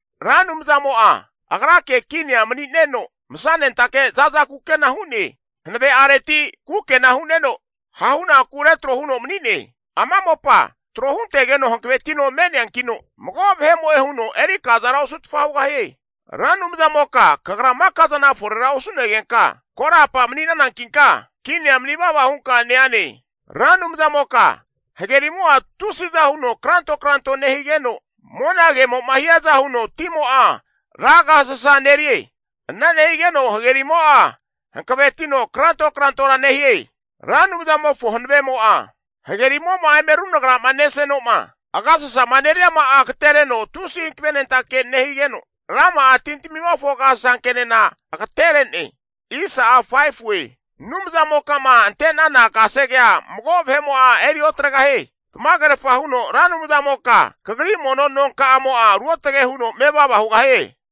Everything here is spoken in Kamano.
Ra Anumzamo'a Agrake kinia mani'neno masanentake zaza kukena hu'ne. Hanave'areti kukena hu'neno hahunaku retro huno mani'ne. Ama mopa tro huntegeno hankavetino me'neankino, mago vahemo'e huno eri kazara osutfa hugahie. Ra Anumzamoka kagra maka zana forera osu'negenka korapa mani'nanankinka, kinia mani vava hunka neane. Ra Anumzamoka hagerimo'a tusiza huno kranto kranto nehigeno, monagemo'ma hiaza huno timo'a ra agasasa nerie. Ana nehigeno hagerimo'a hanavetino kranto krantora nehie. Ra Anumzamofo hanavemo'a hagerimo'ma eme runagrama neseno'ma, agasasama neriama'a agetereno tusi hankavenentake higeno, rama'a tintamimofo agasasankenena agatere'ne. Anumzamoka'ma ante'nana kasegea mago vahe'mo'a eri otregahie. Tamagerfa huno Ra Anumzamoka Kagri mono nonkamo'a ruotge huno mevava hugahie.